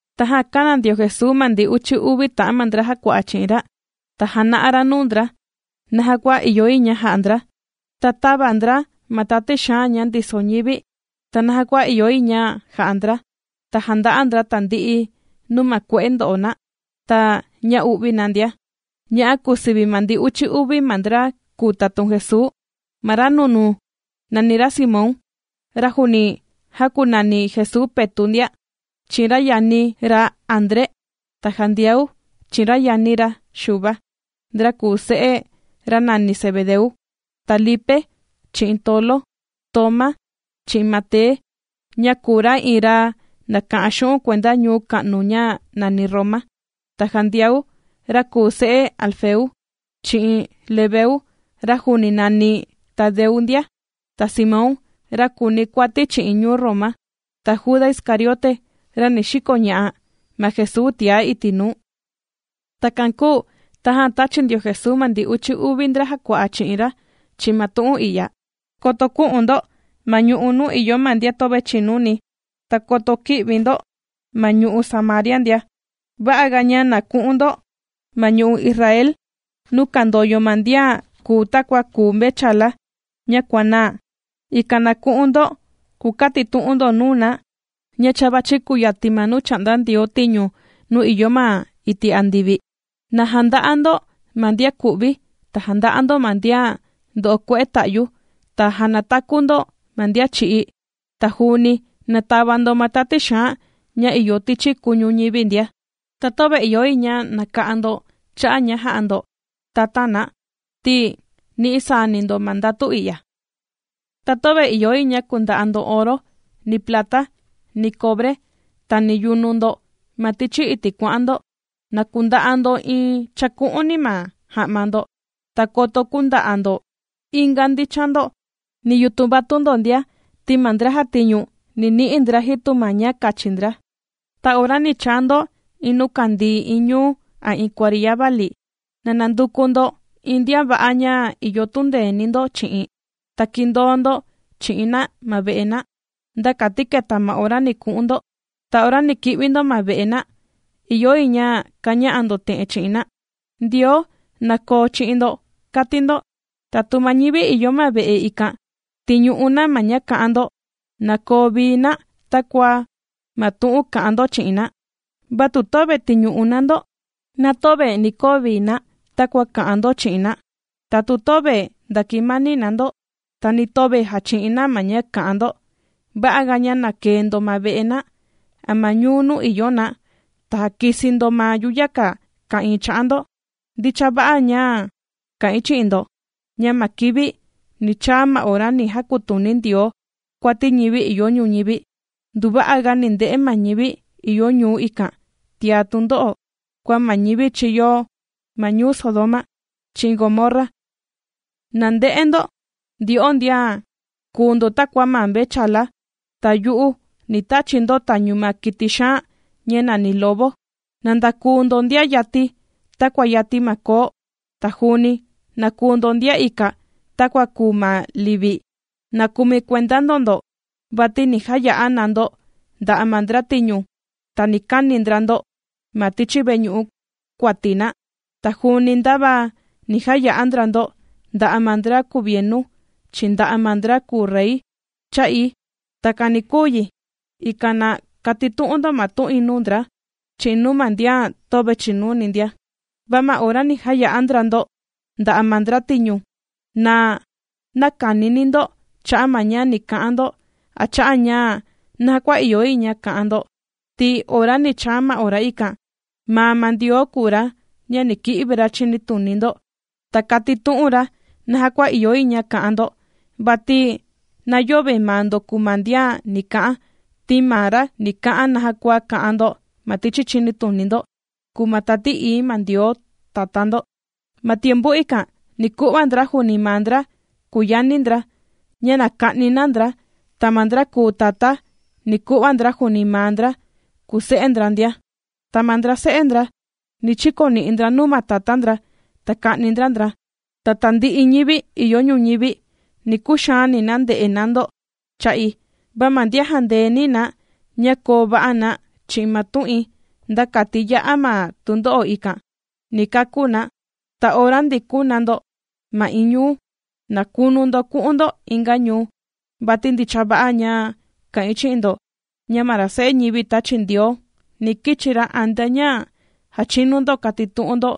Tajan kāna ndio Jesuu ma ndi uchi uvi ta'an ma ndra jàkua'a chi'in ra, ta jāna'a ra nuu ndra, naja kua ìyo yi ña ja'a ndra, ta tàva ndra ma tati xaan ña ndiso ñivi, ta naja kua ìyo yi ña ja'a ndra, ta jànda'a ndra tandi'i nuu ma kue'e ndo'o na, ta ña u'vi na ndia. Ña'a kùu sivi ma ndi uchi uvi ma ndra kùu tatun Jesuu: Ma ra nunuu, nàni ra Simón, ra juuni jākunani Jesuu Petu' ndia, chi'in ra yani ra André, ta Jandiau chi'in ra yani ra Xuva, ndra kùu se'e, ra nàni Zebedeu. Ta Lipe chi'in Tolo, Toma, chi'in Mate, ña kùu ra iin ra nàka'an xu'un' kuenda ñuu ka'nu ña nàni Roma. Ta Jandiau, ra kùu se'e Alfeu, chi'in Lebeu, ra juuni nàni Tadeu ndia. Ta Simón, ra kùuni kuati chi'in ñuu Roma, ta Juda Iscariote, ra ni xikoña'a ma Jesuu tiá iti' nuu. Takan kūu tajan tāchi ndio Jesuu ma ndi uchi uvi ndra jàkua'a chi'in ra chi'in ma tu'un i'ya: ―Koto kü'un ndo ma ñu'u' nuu ìyo ma ndian töve chìnuni, ta koto kï'vi ndo ma ñu'u' Samaria ndia. Va'aga ña na ku'un ndo ma ñu'u' Israel, nuu kandoyo ma ndian kùu takua kùu ma mvechala ña kuànaa. Ikan na ku'un ndo, kukatitu'un ndo nuu na, ña cha vàchi kuyatin ma nuu chà'nda Ndioo tiñu nuu ìyo ma iti' andivi. Na janda'a ndo ma ndian ku'vi, ta janda'a ndo ma ndian ndo'o kue'e ta'yu, ta jànataku ndo ma ndian chī'í. Ta juuni na tava ndo ma tati xaan ña ìyo tichi kuñu ñivi ndia. Ta töve ìyo yi ña naka'an ndo xu'un' cha'a' ña jà'a ndo tatan na, ti nì'i saani ndo ma ndatu i'ya. ’Ta töve ìyo yi ña kunda'a ndo oro, ni plata, ni cobre, ta ni yunu ndo ma tichi iti' kuà'an ndo. Na kunda'a ndo iin chaku'úni ma ja'ma ndo, ta koto künda'a ndo inga ndichan ndo, ni yutun vatun ndo ndia, ti ma ndra jàtiñu, ni ni'i sani ndra jitu ma ña kachini ndra. ’Ta ora ni chaa ndo iin nuu kandii iin ñuu a iin kuariya vali, na nanduku ndo iin ndian va'a ña ìyo tundeeni ndo chi'in, ta kìndoo ndo chi'in na ma ve'e na, nda kati keta ma ora ni ku'un ndo. Ta ora ni ki'vi ndo ma ve'e na, ìyo yi ña kaña'a ndo te'en chi'in na: “Ndioo na koo chi'in ndo”, kati ndo. Ta tu ma ñivi ìyo ma ve'e ikan, tìñu'u na ma ña kà'an ndo, na koo vii na takua ma tu'un kà'an ndo chi'in na. Va tu töve tìñu'u na ndo, na töve ni koo vii na takua kà'an ndo chi'in na. Ta tu töve ndakimani na ndo, ta ni töve jàchi'in na ma ña kà'an ndo, va'aga ña na kee ndo ma ve'e na, a ma ñuu nuu ìyo na, ta jàkisi ndo ma yuyaka ka'ìin cha'a ndo. Ndicha va'a ña kà'in chi'in ndo ña ma kivi ni chaa ma ora ni jakutuni Ndioo kuati ñivi ìyo ñuñivi, nduva'aga ni nde'e ma ñivi ìyo ñuu ikan tiá tundo'o, kua ma ñivi chīyo ma ñuu Sodoma chi'in Gomorra. ’¡Na nde'e ndo! Ndyo'o ndian kùu ndo takua ma mvechala ta yu'u ni tachi̱ ndo tañu ma kiti xaan ña nàni lobo. Na ndakuu ndo ndian yati, takua yati ma koo, ta juuni na kuu ndo ndian ika, takua kùu ma livi. Na kumi kuenda ndo ndo, vati ni jaya'a na ndo nda'a ma ndra tiñu, ta ni kani ndra ndo ma tichi veñu'u kuati na. Ta juuni ndava ni jaya'a ndra ndo, nda'a ma ndra kuvienu, chi'in nda'a ma ndra kùu rey, cha'i. Takan ni kuu yi, ikan na kàtitu'un ndo ma tu'in nuu ndra, chi'in nuu ma ndian töve chìnuni ndia. Va ma ora ni jaya'a ndra ndo nda'a ma ndra tiñu, na näkanini ndo cha'a' ma ña ni ka'an ndo, a cha'a' ña naja kua ìyo yi ña ka'an ndo, ti ora ni chaa ma ora ikan, maa ma Ndioo kùu ra, ña ni ki'vi ra chinituni ndo, ta katitu'un ra naja kua ìyo yi ña ka'an ndo. Vati na yöve maa ndo kùu ma ndian ni ka'an, ti ma ra ni ka'an naja kua ka'an ndo. Ma tichi chinituni ndo kùu ma Tati Ií ma Ndioo Tatá ndo. ’Ma tiempu ikan ni ku'va ndra juuni ma ndra kùu yani ndra, ña na ka'ni na ndra, ta ma ndra kùu tatá, ni ku'va ndra juuni ma ndra kùu se'e ndra ndia. Ta ma ndra se'e ndra ni chikoni'i ndra nuu ma tatá ndra, ta ka'ni ndra ndra. Ta tandi'i ñivi ìyo ñuñivi, ni kuxaani na nde'e na ndo cha'i. Va ma ndian jandeeni na ña koo va'a na chi'in ma tu'in, nda kati ya'a ma tundo'o ikan, ni kakú na. Ta ora ndikun na ndo ma iin ñuu, na kunu ndo ku'un ndo inga ñuu, vati ndicha va'a ña kà'in chi'in ndo, ña ma ra Se'e ñivi tāchi Ndioo, ni kichi ra antea ña jachinu ndo katitu'un ndo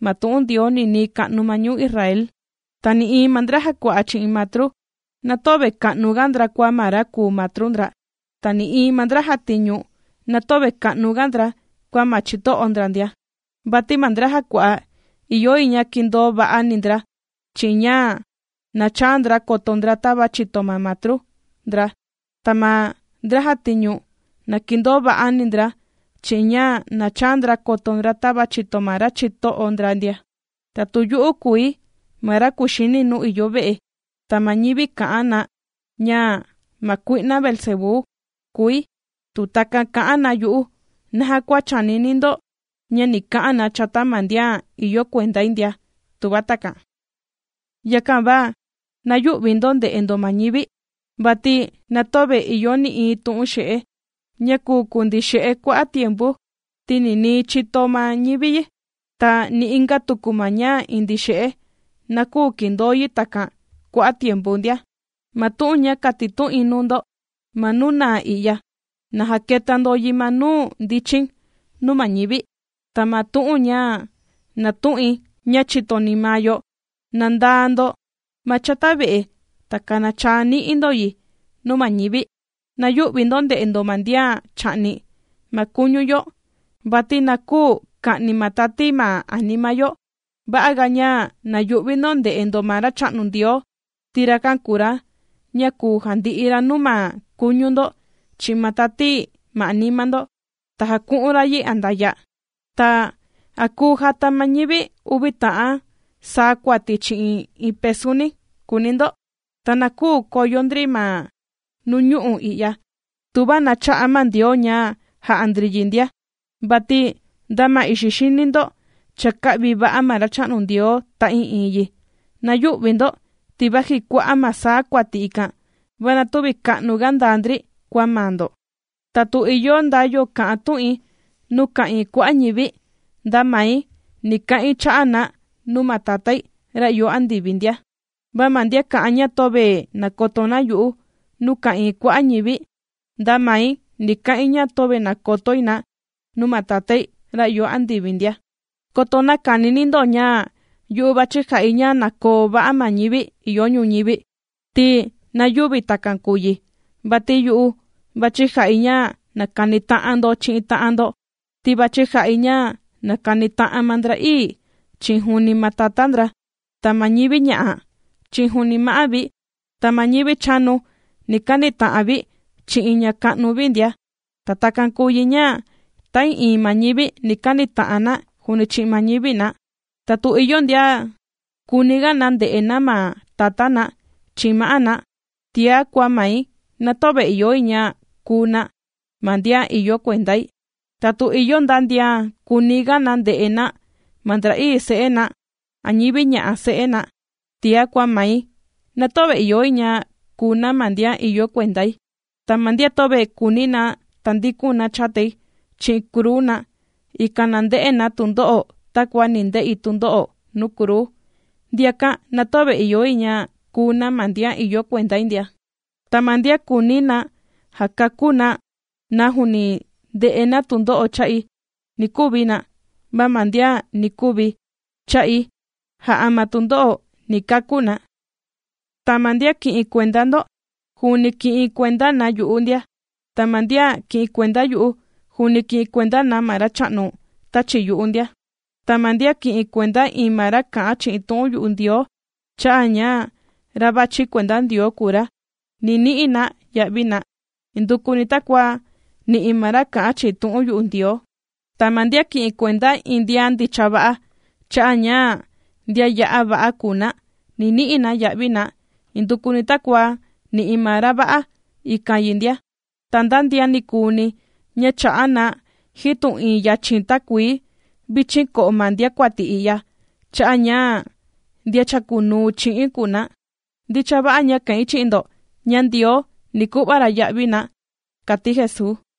ma tu'un Ndioo ninii ka'nu ma ñuu Israel. ’Ta nï'iin ma ndra jàkua'a chi'in matru, na töve ka'nuga ndra kua ma ra kùu matru ndra, ta nï'iin ma ndra jàtiñu, na töve ka'nuga ndra kua ma chito'o ndra ndia. Vati ma ndra jàkua'a, ìyo yi ña kindoo va'ani ndra, chi'in ña na chaa ndra koto ndra tava chìto ma matru ndra. Ta ma ndra jàtiñu, na kindoo va'ani ndra chi'in ña na chaa ndra koto ndra tava chìto ma ra chito'o ndra ndia. Ta tu yu'u kùi ma ra kuxini nuu ìyo ve'e, ta ma ñivi kà'an na ña ma kui'na Beelzebú kùi. Tu takan kà'an na yu'u, ¿naja kua chànini ndo ña ni ka'an na chata ma ndian ìyo kuendai ndia?, tuva takan. ’Yakan va na yü'vi ndo nde'e ndo ma ñivi. Vati na töve ìyo nï'iin tu'un xe'e, ña kùu kundii xe'e kua'a' tiempu, ti ninii chìto ma ñivi yi. Ta ni inga tuku ma ña indii xe'e na küu kindoo yi takan kua'a' tiempu ndia. Ma tu'un ña kàtitu'in nuu ndo ma nuu naa i'ya, na jaketa ndo yi ma nuu ndichin nuu ma ñivi, ta ma tu'un ña nàtu'in, ña chìtoni maa yo, na ndaa ndo ma chata ve'e, ta kanachaa ni'i ndo yi nuu ma ñivi. Na yü'vi ndo nde'e ndo ma ndian chà'ni ma kuñu yo, vati na küu ka'ni ma tati ma anima yo. Va'aga ña na yu'vi ndo nde'e ndo ma Racha'nu Ndioo, ti rakan kùu ra, ña kùu jandi'i ra nuu ma kuñu ndo, chi'in ma tati ma anima ndo, ta jaku'un ra yi andaya'. ’Ta, ¿a kùu jata ma ñivi uvi ta'an saa kuati chi'in iin pesuni?, kùuni ndo. Ta na küu koyo ndri ma nuñu'u' i'ya, tuva na chä'a ma Ndioo ña jà'a ndri yi ndia. Vati nda ma ixi xini ndo, cha kā'vi va'a ma Racha'nu Ndioo ta'ii'iin yi. Na yüvi ndo, ti vaji kua'a' ma saa kuati ikan, va na tüvi ka'nuga ndaa ndri kua maa ndo. ’Ta tu ìyo nda yo kà'an tu'in nuu ka'ìin kua'a' ñivi, nda mai ni ka'in cha'a' na nuu ma Tatái, ra ìyo andivi ndia. Va ma ndian kà'an ña töve nàkoto na yu'u nuu ka'ìin kua'a' ñivi, nda mai ni ka'in ña töve nàkotoi na nuu ma Tatái, ra ìyo andivi ndia. ’Koto näkanini ndo ña yu'u vàchi ja'i ña na koo va'a ma ñivi ìyo ñuñivi, ti na yüvi takan kùu yi. Vati yu'u vàchi ja'i ña na kanita'an ndo chi'in ta'an ndo. Ti vàchi ja'i ña na kanita'an ma ndra'ii, chi'in juuni ma tatá ndra, ta ma ñivi ña'a, chi'in juuni ma'á vi, ta ma ñivi chanu, ni kanita'an vi, chi'in ña ka'nu vi ndia. Ta takan kùu yi ña ta'ii'iin ma ñivi, ni kanita'an na, juuni chi'in ma ñivi na. ’Ta tu ìyo ndian kùuniga na nde'e na ma tatá na, chi'in ma'á na, tiá kua mai, na töve ìyo yi ña kuu na ma ndian ìyo kuendai. Ta tu ìyo nda ndian kùuniga na nde'e na ma ndra'ii se'e na, a ñivi ña'a se'e na tiá kua mai, na töve ìyo yi ña kuu na ma ndian ìyo kuendai. Ta ma ndian töve kùuni na tandikun na chatai chi'in kruu na, ikan na nde'e na tundo'o takua ni nde'i tundo'o nuu kruu, ndiakan na töve ìyo yi ña kuu na ma ndian ìyo kuendai ndia. Ta ma ndian kùuni na jakakú na na nuu ndè'e na tundo'o cha'i, ni kuvi na. Va ma ndian ni kuvi cha'i jà'a ma tundo'o, ni kakú na. ’Ta ma ndian kì'in kuenda ndo, juuni kì'in kuenda na yu'u ndia. Ta ma ndian kì'in kuenda yu'u, juuni kì'in kuenda na ma Racha'nu tāchi yu'u ndia. Ta ma ndian kì'in kuenda iin ma ra kà'an chi'in tu'un yu'u Ndioo, cha'a' ña ra vàchi kuenda Ndioo kùu ra, ni ni'i na ya'vi na, indukuni takua nì'i ma ra kà'an chi'in tu'un yu'u Ndioo. Ta ma ndian kì'in kuenda iin ndian ndicha va'a, cha'a' ña ndian ya'a va'a kùu na, ni ni'i na ya'vi na, indukuni takua nì'i ma ra va'a ikan yi ndia. Ta nda ndian nikuuni, ña chà'a na jitu iin yachin takuii vichin ko'o ma ndiakuati i'ya, cha'a' ña ndian chàkunuu chi'i̱n kùu na, ndicha va'a ña kà'in chi'in ndo ña Ndioo ni ku'va ra ya'vi na ndia ―kàti Jesuu.